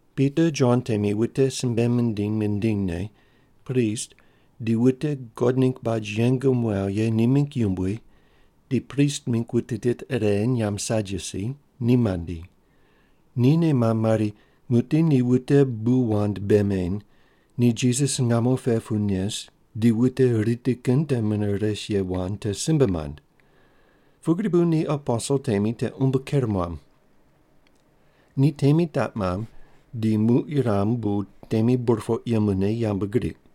Pita Jon temi wute simbe mindiny mindinyne, prist di wute God ningg baj yeng muaw ye ni mingg yumbui di prist mingg wute tit ire nyamb Sadyusi ni mandi. Ni nei mamb mari, “Muqdi ni wute bu wand bei meny, ni Jisas ngamo pe pu nes di wute riti kin te mune res ye wand te simbe mand.” Pugri bu ni aposel temi te umbo ker muam. Ni temi taq mamb, di muq yuram bu temi burpoq yemune yambgriq.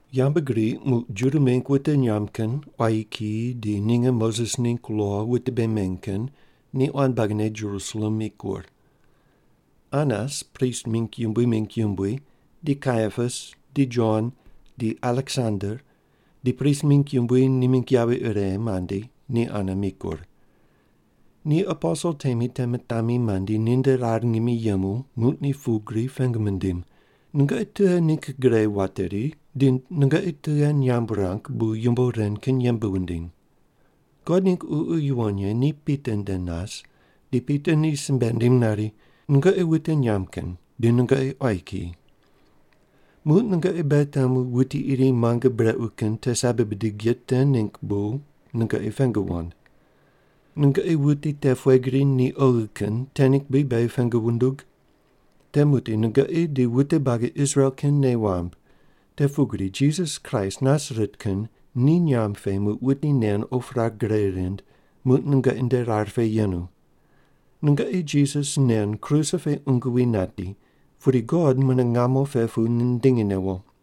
Yambgriq muq Juda mingg wute nyamb kin, quayi kiyi, di ninge Moses ningg lo wute bei meny kin ni quan buagine Jerusalem mikur. Anas prist mingg yumbui mingg yumbui, di Kaiapas, di Jon, di Aleksander, di prist mingg yumbui ni mingg yavi ire mandi, ni ane mikur. Ni aposel temi te mitami mandi, ninde rar ngimi yemu, muq ni pugri pengu mindim, “Nungoqi tughe ningg gre wateri di nungoqi tughe nyamb wurang bu yumbo ren kin yembe wundiny?” God ningg Ququ Yuwon Ye ni Pita nde nas, di Pita ni simbe nindim nari, “Nungoqi wute nyamb kin, di nungoqi quayi kiyi. Muq nungoqi beghi temu wuti iri muange brequ kin te sabi bidig ye te ningg bu nungoqi pengu wand. Nungoqi wuti te pughe gri ni oghi kin te ningg bri beghi pengu wundug? Te muqdi nungoqi di wute buagi Israel kin nei wamb, te pugri Jisas Kraist Nasaret kin ni nyamb pe muq wuti nen op rar gre rind, muq nungoqi nde rar pe yenu. Nungoqi Jisas nen kruse pe qungu wi nati, pudi God mune ngamo pe pu nindingi newo.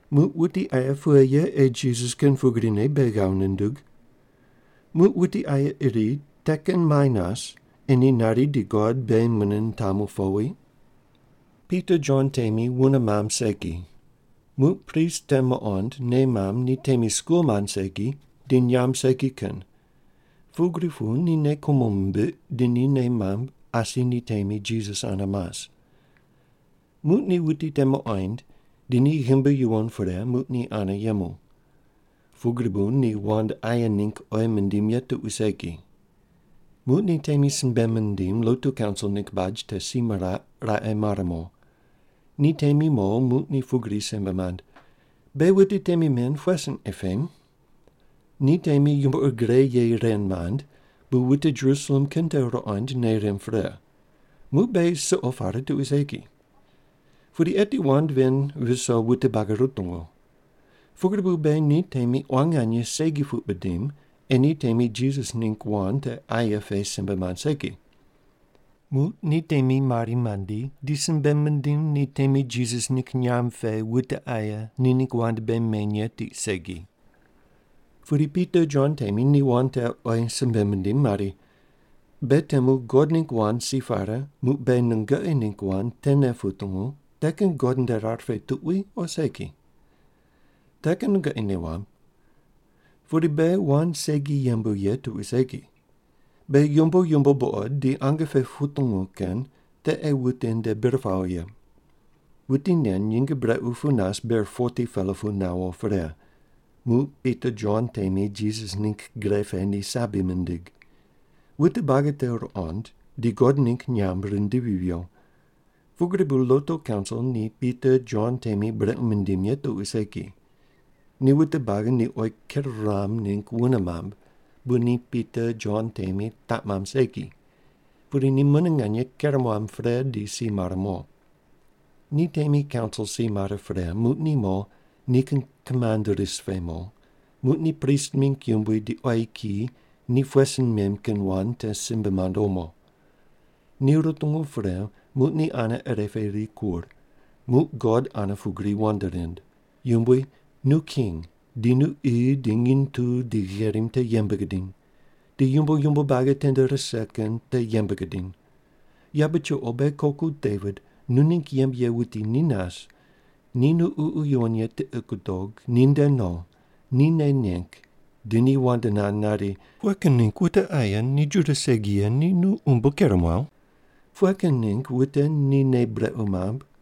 Muq wuti aye pughe ye ei Jisas kin pugrine beghi ghav nundug? Muq wuti aye iri te kin muai nas ei ni nari di God beghi mune nitamu powi?” Pita Jon temi wune mamb segi. Muq prist te muqond nei mamb ni temi skul mand segi, di nyamb segi kin. Pugri pu ni nei kumo mimbiq, di ni nei mamb asi ni temi Jisas ane mas. Muq ni wuti te muqoind, di ni ghimbi yuwon pre, muq ni ane yemu. Pugri bu ni wand aye ningg oyi mindim ye tuqui segi. Muq ni temi simbe mindim lotu kaunsil ningg baj te si miraq, raqe mar mo. Ni temi mo, muq ni pugri simbe mand, “Beghi wute temi men pughe sin ei pem? Ni temi yumbo ur gre ye ren mand, bu wute Jerusalem kin te ruqond nei rimb pre. Muq beghi suqo pare tuqui segi. Pudi eti wand ven viso wute buagi rutungu. Pugri bu beghi ni temi quan nganye segi puq bidim ei ni temi Jisas ningg wand te aye pe simbe mand segi.” Muq ni temi mari mandi di simbe mindim ni temi Jisas ningg nyamb pe wute aye ni ningg wand bei meny ye tiq segi. Pudi Pita Jon temi ni wand te oyi simbe mindim mari, “Beghi temu God ningg wand si pare muq beghi nungoqi ningg wand tene putungu te kin God nde rar pe tuqui o segi? Te kin nungoqi nei wamb. Pudi beghi wand segi yembu ye tuqui segi. Beghi yumbo yumbo buqod di ange pe putungu kin te ei wute nde bir pawo ye.” Wuti nen nyinge brequ pu nas ber 40-pela pu nawo pre, muq Pita Jon temi Jisas ningg gre pe ni sabi mindig. Wute buagi te ruqond, di God ningg nyamb rindivi viyo. Pugri bu lotu kaunsil ni Pita Jon temi brequ mindim ye tuqui segi, ni wute buagi ni oyi ker ruam ningg wune mamb, bu ni Pita Jon temi taq mamb segi. Pudi ni mune nganye ker muam pre di si mare mo. Ni temi kaunsil si mare pre, muq ni mo, nikin kimand ris pe mo, muq ni prist mingg yumbui di quayi kiyi ni pughe sin mem kin wand te simbe mand omo. Ni rutungu pre, muq ni ane ire pe rikur, muq God ane pugri wand rind: “Yumbui, nu King di nu qi di nginy tu di gherim te yembe gudiny, di yumbo yumbo buagi tende rise kin te yembe gudiny. Yabe chuqo beghi koku Devit nu ningg yembe ye wuti ni nas, di nu Ququ Yuwon Ye tiqi gudog, ni nde no, ni nei neng, di ni wand nand nari, ‘Pughe kin ningg wute aye ni Juda segi ye ni nu umbo ker muaw? Pughe kin ningg wute ni nei brequ mamb?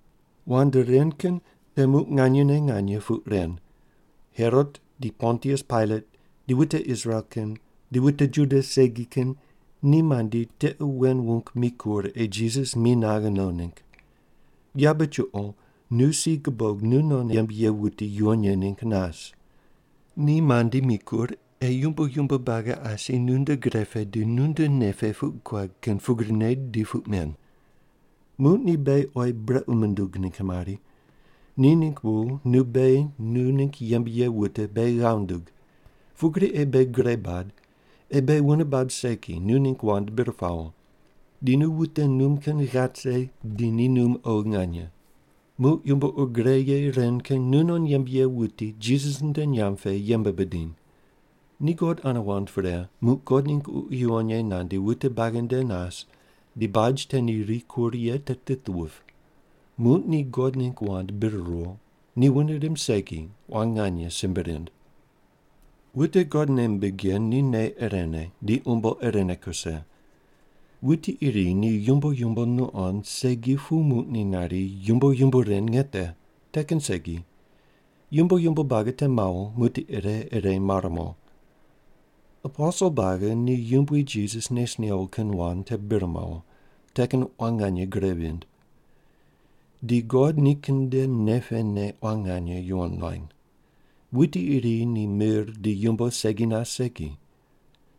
“Wand ren kin te muq nganyene nganye puq ren, Herot di Pontius Pailat, di wute Israel kin, di wute Juda segi kin ni mandi, tiqe wen wung mikur, ei Jisas mi naghe no ningg. Yabe chuqo nu si gubog nunon yembe ye wuti yuwon ye ningg nas. Ni mandi, mikur, ei yumbo yumbo buagi asi nunde gre pe di nunde nei pe puq guad kin pugrine di puq men. Muq ni beghi oyi brequ mundug ningg mari, te ningg bu nu beghi nu ningg yembe ye wute beghi ghav ndug. Pugri ei beghi gre bad, ei beghi wune bab segi nu ningg wand bir pawo. Di nu wute num kin ghat rise di ni num oghi nganye. Muq yumbo ur gre ye ren kin nunon yembe ye wuti Jisas nde nyamb pe yembe bidiny.” Ni God ane wand pre, muq God ningg Ququ Yuwon Ye nandi wute buagi nde nas di baj te ni rikur ye te tit vip. Muq ni God ningg wand bir ruwo. Ni wune rimb segi quan nganye simbe rind. Wute God nei mimbig ye ni nei irene, di umbo irene kuse. Wuti iri ni yumbo yumbo nuqond segi pu muq ni nari, “Yumbo yumbo ren nge te.” Te kin segi. Yumbo yumbo buagi te mawo, muqdi ire ire mare mo. Aposel buagi ni Yumbui Jisas nes newo kin wand te bir mawo, te kin quan nganye gre vind. Di God nikin nde nei pene quan nganye yuwon nuany. Wuti iri ni mir di yumbo segi nas segi.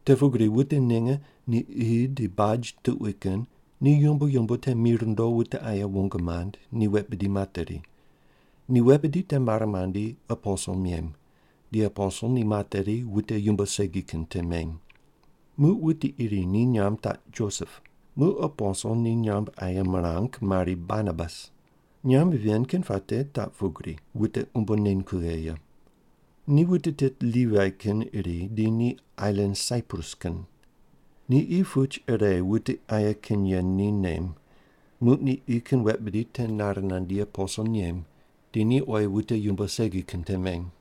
Te pugri wute ninge ni qi di baj tuqui kin ni yumbo yumbo te mi rundo wute aye wong mand, ni wet bidi materi. Ni wet bidi te mare mandi, aposel mem. Di aposel ni materi, wute yumbo segi kin te meny. Muq wuti iri ni nyamb taq Josep. Muq aposel ni nyamb aye mirang mari Barnabas. Nyamb ven kin puate taq pugri: “Wute umbo neny kughe ye.” Ni wute tit Livai kin iri di ni ailan Saiprus kin. Ni qi puch ire wute aye kin ye ni nem. Muq ni qi kin wet bidi te nare nandi, aposel nem, di ni oyi wute yumbo segi kin te meny.